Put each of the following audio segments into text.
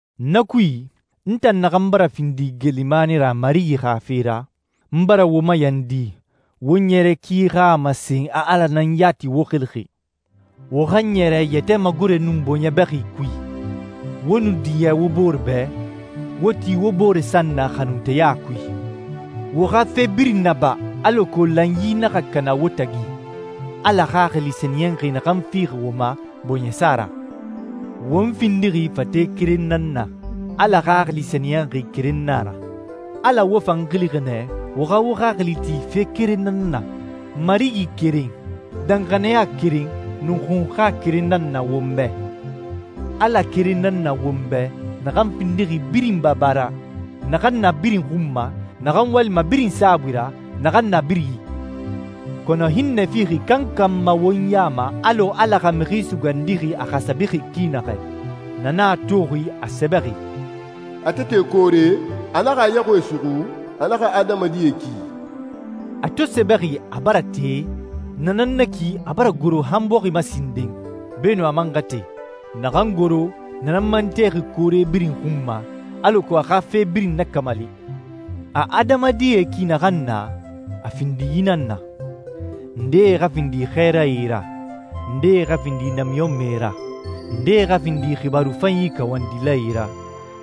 Na kui, n tan naxan bara findi geelimani ra Marigi xa fe ra, n bara wo mayandi wo ɲɛrɛ ki xa a masen a Ala nan yati wo xilixi. Wo xa ɲɛrɛ yɛtɛ magore nun bɔɲɛ bɛxi kui, wo nu diɲɛ wo bore bɛ, wo ti wo bore san na xanunteya kui. Wo xa fe birin naba alako lanyi naxa kana wo tagi, Ala Xaxili Sɛniyɛnxi naxan fixi wo ma bɔɲɛsa ra. Won findixi fate keren nan na. Ala Xaxili Sɛniyɛnxi keren nan a ra. Ala wo fan xilixi nɛ wo xa wo xaxili ti fe keren nan na. Marigi keren, danxaniya keren, nun xunxa keren nan na won bɛ. Ala keren nan na won bɛ naxan findixi birin Baba ra, naxan na birin xun ma, naxan walima birin saabui ra, naxan na birin i. Kɔnɔ hinnɛ fixi kankan ma won ya ma alɔ Ala xa Mixi Sugandixi a xasabixi ki naxɛ. Na nan a toxi a sɛbɛxi, «A to te koore, a naxa a yaxuie suxu, a naxa adamadie ki.» A to sɛbɛxi, «A bara te,» na nan na ki a bara goro han bɔxi ma sinden, beenun a man xa te. Naxan goro, na nan man texi koore birin xun ma, alako a xa fe birin nakamali. A adamadie ki naxan na, a findi yi nan na: ndee xa findi xɛɛrae ra, ndee xa findi namiɲɔnmɛe ra, ndee xa findi xibaaru fanyi kawandilae ra,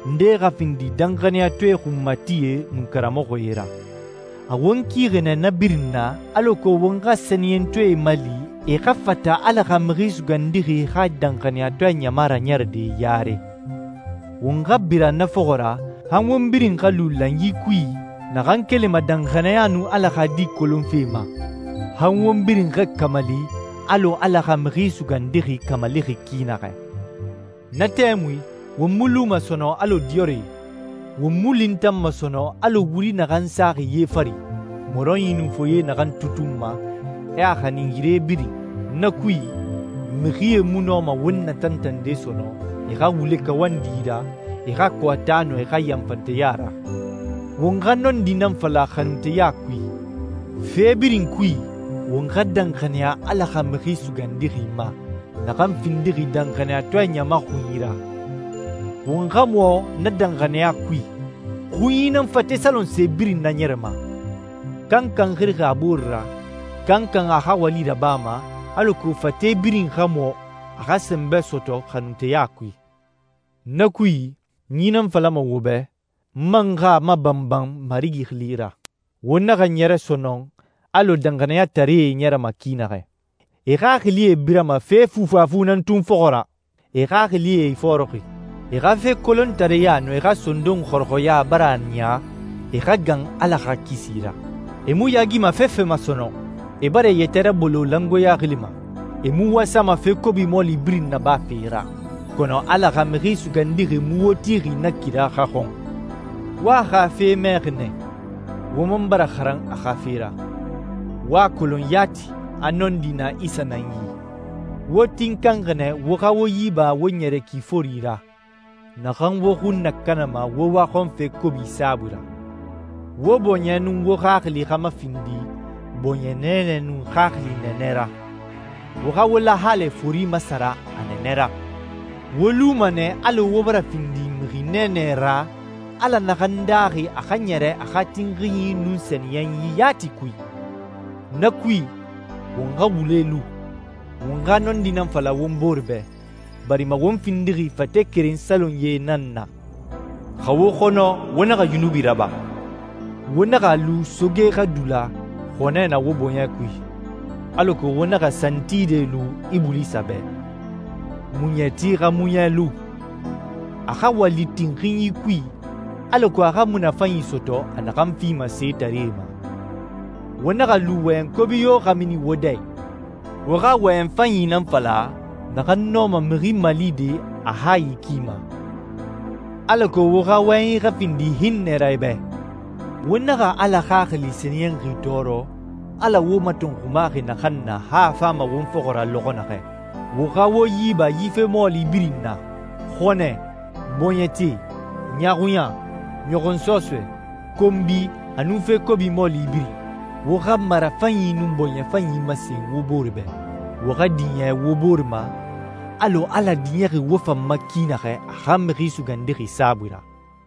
ndee xa findi danxaniyatɔɛe xunmatie nun karamɔxɔe ra. A won kixi nɛ na birin na alako won xa sɛniyɛntɔɛe mali e xa fata Ala xa Mixi Sugandixi xa danxaniyatɔɛ ɲama raɲɛrɛde yare. Won xa bira na fɔxɔ ra han won birin xa lu lanyi kui naxan kelima danxaniya nun Ala xa Di kolonfe ma, han won birin xa kamali alɔ Ala xa Mixi Sugandixi kamalixi ki naxɛ. Na tɛmui won mu luma sɔnɔn alɔ diyɔrɛe. Won mu lintanma sɔnɔn alɔ wuri naxan saxi ye fari, mɔrɔnyi nun foye naxan tutunma, e a xanin yire birin. Na kui, mixie mu nɔma won natantande sɔnɔn e xa wule kawandi ra, e xa kɔɔta, nun e xa yanfanteya ra. Won xa nɔndi nan fala xanunteya kui. Fe birin kui, won xa danxaniya Ala xa Mixi Sugandixi ma, naxan findixi danxaniyatɔɛ ɲama xunyi ra. Won xa mɔ na danxaniya kui. Xunyi nan fate salonse birin naɲɛrɛma. Kankan xirixi a boore ra, kankan a xa wali rabama, alako fate birin xa mɔ, a xa sɛnbɛ sɔtɔ xanunteya kui. Na kui, n yi nan falama wo bɛ, n man xa a mabanban Marigi xili ra: Wo naxa ɲɛrɛ sɔnɔn alɔ danxaniyataree ɲɛrɛma ki naxɛ. E xaxilie birama fe fufafu nan tun fɔxɔ ra. E xaxilie ifɔɔrɔxi. E xa fe kolontareya nun e xa sondon xɔrɔxɔya bara a niya e xa gan Ala xa kisi ra. E mu yaagima fefe ma sɔnɔn. E bara e yɛtɛ rabolo langoeɲa xili ma. E mu wasama fe kobi mɔɔli birin nabafe ra. Kɔnɔ Ala xa Mixi Sugandixi mu wo tixi na kira xa xɔn! Wo a xa fe mɛxi nɛ, wo man bara xaran a xa fe ra. Wo a kolon yati a nɔndi na Isa nan yi. Wo tinkanxi nɛ wo xa wo yi ba wo ɲɛrɛ ki fori ra, naxan wo xun nakanama wo waxɔnfe kobi saabui ra. Wo bɔɲɛ nun wo xaxili xa mafindi bɔɲɛ nɛɛnɛ nun xaxili nɛɛnɛ ra. Wo xa wo lahalɛ fori masara a nɛɛnɛ ra. Wo luma nɛ alɔ wo bara findi mixi nɛɛnɛ ra Ala naxan daaxi a xa ɲɛrɛ a xa tinxinyi nun sɛniyɛnyi yati kui. Na kui, won xa wule lu, won xa nɔndi nan fala won bore bɛ, barima won findixi fate keren salonyie nan na. Xa wo xɔnɔ, wo naxa yunubi raba. Wo naxa a lu soge xa dula xɔnɛ na wo bɔɲɛ kui, alako wo naxa santide lu Ibulisa bɛ. Muɲɛti xa muɲɛ lu. A xa wali tinxinyi kui alako a xa munafanyi sɔtɔ a naxan fima setaree ma. Wo naxa a lu wɔyɛn kobi yo xa mini wo dɛ i. Wo xa wɔyɛn fanyi nan fala naxan nɔma mixi malide a hayi ki ma, alako wo xa wɔyɛnyi xa findi hinnɛ ra e bɛ. Wo naxa Ala Xaxili Sɛniyɛnxi tɔɔrɔ, Ala wo matɔnxumaxi naxan na han a fama won fɔxɔ ra lɔxɔ naxɛ. Wo xa wo yi ba yi fe mɔɔli birin na: xɔnɛ, bɔɲɛte, ɲaaxuɲa, ɲɔxɔnsɔsɔɛ, konbi, a nun fe kobi mɔɔli birin. Wo xa marafanyi nun bɔɲɛ fanyi masen wo bore bɛ. Wo xa diɲɛ wo bore ma alɔ Ala diɲɛxi wo fan ma ki naxɛ a xa Mixi Sugandixi saabui ra.